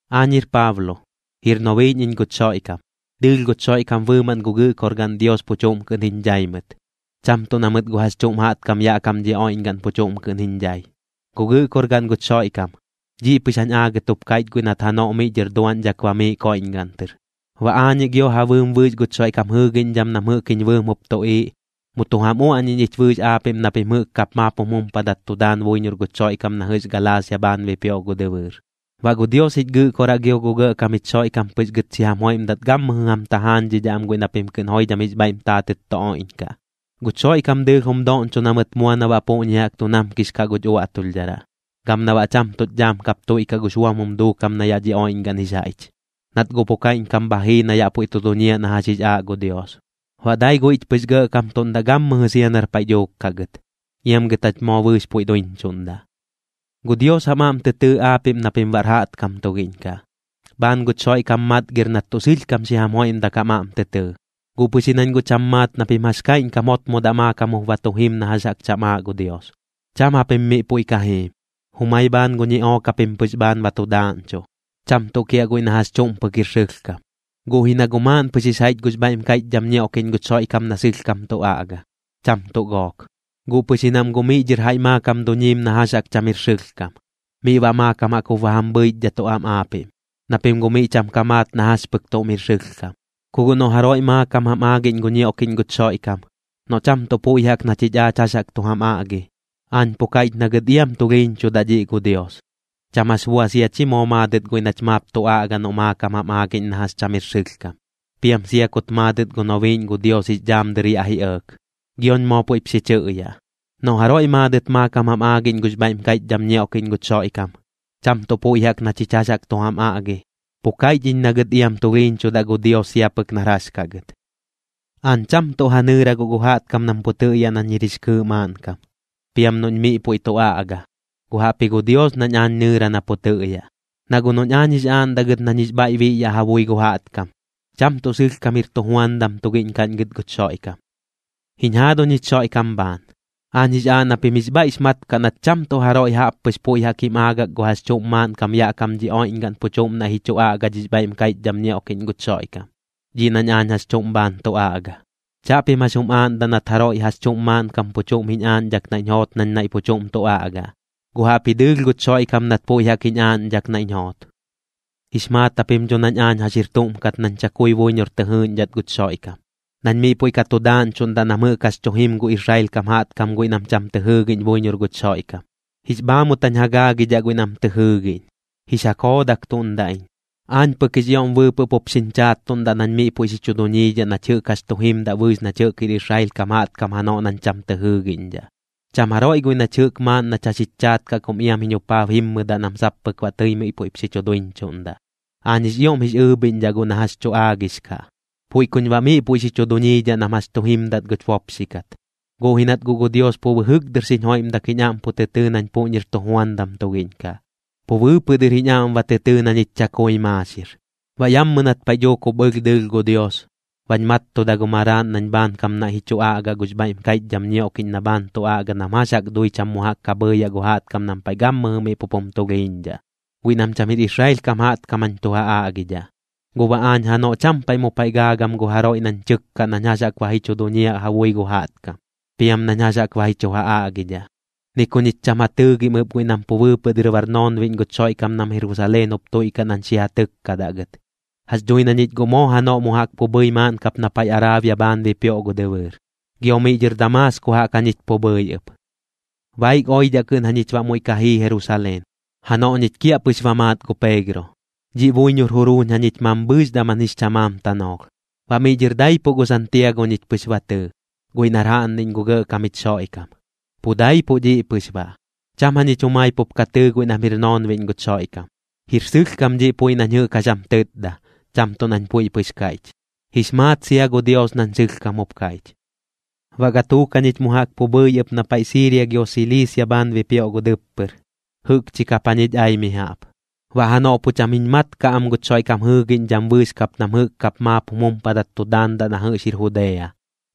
Aañ jir Paablo, jir nobiiꞌñ iñ guch Xoiꞌkam. Dɨɨlh guch Xoiꞌkam bɨɨmaꞌn gu Gɨꞌkorgaꞌn Dios pu chuꞌm kɨꞌn jiñ dhai mɨt, cham tuꞌ na mɨt gu jax chuꞌm jaꞌtkam yaꞌ kam dhi oiꞌñgaꞌn pu chuꞌm kɨꞌn jiñ dhai. Gu Gɨꞌkorgaꞌn guch Xoiꞌkam, dhiꞌ pɨx jañ aagɨt jup kaiꞌch guiꞌ nat janoꞌ miꞌ dhɨr duaꞌñdhak bamiiꞌ koiꞌñgaꞌn tɨr. Baꞌ aañiꞌ gio ja bɨɨm bɨɨx guch Xoiꞌkam jɨɨgiꞌñdham nam jɨꞌk jiñ bɨɨm jup tuꞌiiꞌ, mu tu jam uaꞌñiꞌñ ich bɨɨx aapiꞌm na pim jɨꞌk kap maap jum jumpadat tu daan buiñor guch Xoiꞌkam na jɨꞌx Galaasia bhaan bipioꞌ gu dɨbɨɨr. Baꞌ gu Dios jich Gɨꞌkoraꞌ gio gu Gɇꞌkam jich Xoiꞌkam pɨx gɨt xi jam joiꞌmdat gammɨjɨ jam tajaañdhidhaꞌ am guiꞌ na pim kɨꞌn joidham jix bhaiꞌm taatɨt tu oiꞌñkaꞌ. Guch Xoiꞌkam dɨɨlh jum doꞌñcho na mɨt mua na baꞌ puꞌñi jaꞌk tu namkix kaꞌ guch uaꞌtulhdharaꞌ, gam na baꞌ cham tuꞌch dhaam kap tuiꞌkaꞌ gux buam jum duukam na yaꞌ dhi oiꞌñgaꞌn jix jaiꞌch, nat guꞌ pu kaiꞌñkam bha jii na yaꞌ puiꞌ tu duñiaꞌ na jax jix aaꞌ gu Dios. Baꞌ dai guiꞌch pɨx gɇꞌkamtuꞌndaꞌ gammɨjɨ sia nar paiꞌ dhuuk kaꞌ gɨt. ¡Iam gɨt jach moo bɨɨx puiꞌ duiñchuꞌndaꞌ! Gu Dios jam aꞌm tɨ tɨɨ aapiꞌm na pim baꞌr jaꞌtkam tugiꞌñ kaꞌ, bhaan guch Xoiꞌkam matgir nat tuꞌ sɨlhkam xi jam joiꞌmdak jam aꞌm tɨ tɨɨ. Guꞌ pɨx ji nañ guꞌ cham maat na pim jax kaiꞌñkam jotmodaꞌ maakam jup ba tu jim na jax jaꞌk cham aaꞌ gu Dios. Cham japim miꞌ puiꞌ ka jiim, jumai bhaan gu ñiꞌook japim pɨx bhaan ba tu daaꞌñchuꞌ, cham tuꞌ kiaꞌ guiꞌ na jax chuꞌm pɨk jir sɨlhkam. Guꞌ ji na guꞌ maaꞌn pɨx jix jaiꞌch gux bhaiꞌm kaiꞌchdham ñioꞌkiꞌñ guch Xoiꞌkam na sɨlhkam tu aꞌga, cham tuꞌ gook, guꞌ pɨx ji nam guꞌ miꞌ dhɨr jaiꞌ maakam duñiim na jax jaꞌk cham jir sɨlhkam. Miꞌ baꞌ maakam jaꞌk jup ba jam bhɨichdhatuꞌ am aapiꞌm, na pim guꞌ miꞌ cham ka maat na jax pɨk tuꞌm jir sɨlhkam. Ku guꞌ noꞌ jaroiꞌ maakam jam aagiꞌñ gu ñioꞌkiꞌñ guch Xoiꞌkam, noꞌ cham tuꞌ puiꞌ jaꞌk na chich aach jax jaꞌk tu jam aꞌgi, aañ pu kaiꞌch na gɨt iam tulhiiñchudaꞌ dhiꞌ gu Dios. Cham jax bua sia chi moo maadɨt guiꞌ nach maap tu aꞌga noꞌm maakam jam aagiꞌñ na jax cham jir sɨlhkam, piam sia kut maadɨt gu nobiiꞌñ gu Dios jix dhaam dɨr yaꞌ ji ɇɇk. Gioñ moo puiꞌp xi chɨꞌyaꞌ: Noꞌ jaroiꞌ maadɨt maakam jam aagiꞌñ gux bhaiꞌm kaiꞌchdham ñioꞌkiꞌñ guch Xoiꞌkam, cham tuꞌ puiꞌ jaꞌk na chich jax jaꞌk tu jam aꞌgi, pu kaiꞌch iñ na gɨt iam tulhiiñchudaꞌ gu Dios sia pɨk nar jax kaꞌ gɨt. Aañ cham tuꞌ ja nɨɨra guꞌ gu jaꞌtkam nam pu tɨꞌyaꞌ nañ jir jix kɨɨꞌ maaꞌnkam, piam noꞌñ miꞌ puiꞌ tu aꞌga, guꞌ jaꞌpji gu Dios nañ aañ nɨɨra na pu tɨꞌyaꞌ. Na guꞌ noꞌñ aañ jix aaꞌndaꞌ gɨt nañ jix bhaiꞌ biꞌyaꞌ ja bui gu jaꞌtkam, cham tuꞌ sɨlhkam jir tujuandam tugiꞌñ kaꞌñ gɨt guch Xoiꞌkam. Jiñ jaaduñ jich Xoiꞌkam bhaan, aañ jix aaꞌ na pim jix bhaiꞌx mat kaꞌ nat cham tuꞌ jaroiꞌ jaꞌp pɨx puiꞌ jaꞌk jim aagak gu jax chuꞌm maaꞌnkam yaꞌ kam dhi oiꞌñgaꞌn pu chuꞌm naiꞌ ji chu aꞌga dhix bhaiꞌm kaiꞌchdham ñioꞌkiꞌñ guch Xoiꞌkam, dhiꞌ nañ aañ jax chuꞌm bhaan tu aꞌga. Chaꞌpim jax jum aaꞌndaꞌ nat jaroiꞌ jax chuꞌm maaꞌnkam pu chuꞌm jiñ aaꞌñdhak naiꞌñ joot nañ naiꞌ pu chuꞌm tu aꞌgaꞌ, guꞌ jaꞌpji dɨɨlh guch Xoiꞌkam nat puiꞌ jaꞌk jiñ aaꞌñdhak naiꞌñ joot. Jix maat japim dho nañ aañ jax jir tuꞌm kat nañ chakui buiñor tɨ jɨɨꞌñdhat guch Xoiꞌkam, nañ miꞌ puiꞌ ka tu daaꞌñchuꞌndaꞌ nam jɨꞌk jax tu jim gu Israel kam jaꞌtkam guiꞌ nam cham tɨ jɨɨgiꞌñ buiñor guch Xoiꞌkam. Jix bhaamut jañ ja gaagidhaꞌ guiꞌ nam tɨ jɨɨgiꞌñ, jix ja koodaktuꞌndaꞌ iñ. Aañ pɨk jix ioꞌm bɨɨpɨꞌ pup xiñ chaattuꞌndaꞌ nañ miꞌ puiꞌ xi chu duñiidhaꞌ nach jɨꞌk jax tu jimdaꞌ bɨɨx nach jɨꞌk jir Israel kam jaꞌtkam janoꞌ nañ cham tɨ jɨɨgiꞌñdhaꞌ. Cham jaroiꞌ guiꞌ nach jɨꞌk maaꞌn nach jax jich chaat kaꞌ kum iam jiñ jupaab jimmɨdaꞌ nam sap pɨk baꞌ tɨi miꞌ puiꞌp xi chu duiñchuꞌndaꞌ. Aañ jix ioꞌm jix ɨɨbhiꞌñdhaꞌ guꞌ na jax tu aagix kaꞌ, puiꞌ kuñ baꞌ miꞌ puiꞌ xi chu duñiidhaꞌ nam jax tu jimdat guch bopxi kat. Guꞌ ji nat guꞌ gu Dios pu bɨjɨk dɨr xiñ joiꞌmdak jiñ aꞌm pu tɨ tɨɨ nañ puꞌñir tujuandam tugiꞌñ kaꞌ, pu bɨɨpɨꞌ dɨr jiñ aꞌm ba tɨ tɨɨ na ñich chakui maaxir. Baꞌ yammɨ nat paiꞌ dhuuk jup ɨlh dɨɨlh gu Dios, bañ mattuda gu Maraaꞌn nañ baꞌ bhaankam naiꞌ ji chu aꞌgaꞌ gux bhaiꞌm kaiꞌchdham ñioꞌkiꞌñ na bhaan tu aꞌga nam jax jaꞌk dui cham mu jaꞌk ka bhɨɨyaꞌ gu jaꞌtkam nam paiꞌ gammɨjɨ miꞌ pup jum tulhiiñdhaꞌ, guiꞌ nam cham jir Israel kam jaꞌtkam jañ tu ja aꞌgidhaꞌ. Guꞌ baꞌ aañ janoꞌ cham paiꞌ mu paiꞌ gaagam gu jaroiꞌ nañ tɨkkaꞌ nañ jax jaꞌk ba ji chu duñiaꞌ ja bui gu jaꞌtkam, piam nañ jax jaꞌk ba ji chu ja aꞌgidhaꞌ. Ni ku ñich cham ja tɨɨgim ɨp guiꞌ nam pu bɨɨpɨꞌ dɨr bar noonbiꞌñ guch Xoiꞌkam nam Jerusaleen jup tuiꞌkaꞌ nañ xi ja tɨkkadaꞌ gɨt. Jax dhui na ñich guꞌ moo janoꞌ mu jaꞌk pu bhɨi maaꞌn kap na paiꞌ Araabia bhaan bipioꞌ gu dɨbɨɨr, gio miꞌ dhɨr Damaasko jaꞌk jañich pu bhɨi ɨp. Baik oidhaꞌ kɨꞌn jañich baꞌ muiꞌ ka jii Jerusaleen, janoꞌ ñich kiaꞌpɨx ba maat gu Peegro. Dhiꞌ buiñor juruuñ jañich mambhɨɨx daman jix chamaam tanoolh. Baꞌ miꞌ dhɨr daipuꞌ gu Santiago ñich pɨx ba tɨɨ, guiꞌ nar jaꞌnniꞌñ gu Gɇꞌkam jich Xoiꞌkam. Pu daipuꞌ dhiꞌ pɨx baꞌ, cham jañich jumai pup ka tɨɨ guiꞌ nam jir noonbiꞌñ guch Xoiꞌkam. Jir sɨlhkam dhiꞌ puiꞌ nañ jɨꞌk jax jam tɨtda, cham tuꞌ nañ puiꞌ pɨx kaiꞌch. Jix maat sia gu Dios nañ sɨlhkam jup kaiꞌch. Baꞌ gatuuk jañich mu jaꞌk pu bhɨi ɨp na paiꞌ Siiria gio Siliisia bhaan bipioꞌ gu dɨppɨr, jɨꞌkchi kap jañich ai mi jaꞌp. Baꞌ janoꞌ pu cham jiñ mat kaꞌ am guch Xoiꞌkam jɨɨgiꞌñdham bɨɨx kap nam jɨꞌk kap maap jum jumpadat tu daandaꞌ na jɨꞌx jir Judea,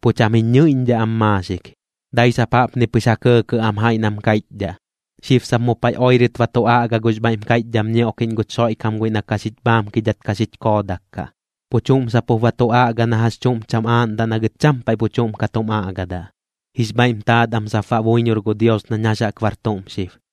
pu cham jiñ ñɨiꞌñdhaꞌ am maaxik. Dai sap jaꞌpni pɨx ja kɇɇkɇꞌ am jaiꞌ nam kaiꞌchdhaꞌ: “Xib sap mu paiꞌ oirɨt ba tu aꞌga gux bhaiꞌm kaiꞌchdham ñioꞌkiꞌñ guch Xoiꞌkam guiꞌ na ka xich bhaamkidhat ka xich koodak kaꞌ. Pu chuꞌm sap jup ba tu aꞌga na jax chuꞌm cham aaꞌndaꞌ na gɨt cham paiꞌ pu chuꞌm ka tum aꞌgadaꞌ.” Jix bhaiꞌm taat am sap baꞌ buiñor gu Dios nañ jax jaꞌk bar tuꞌm xib.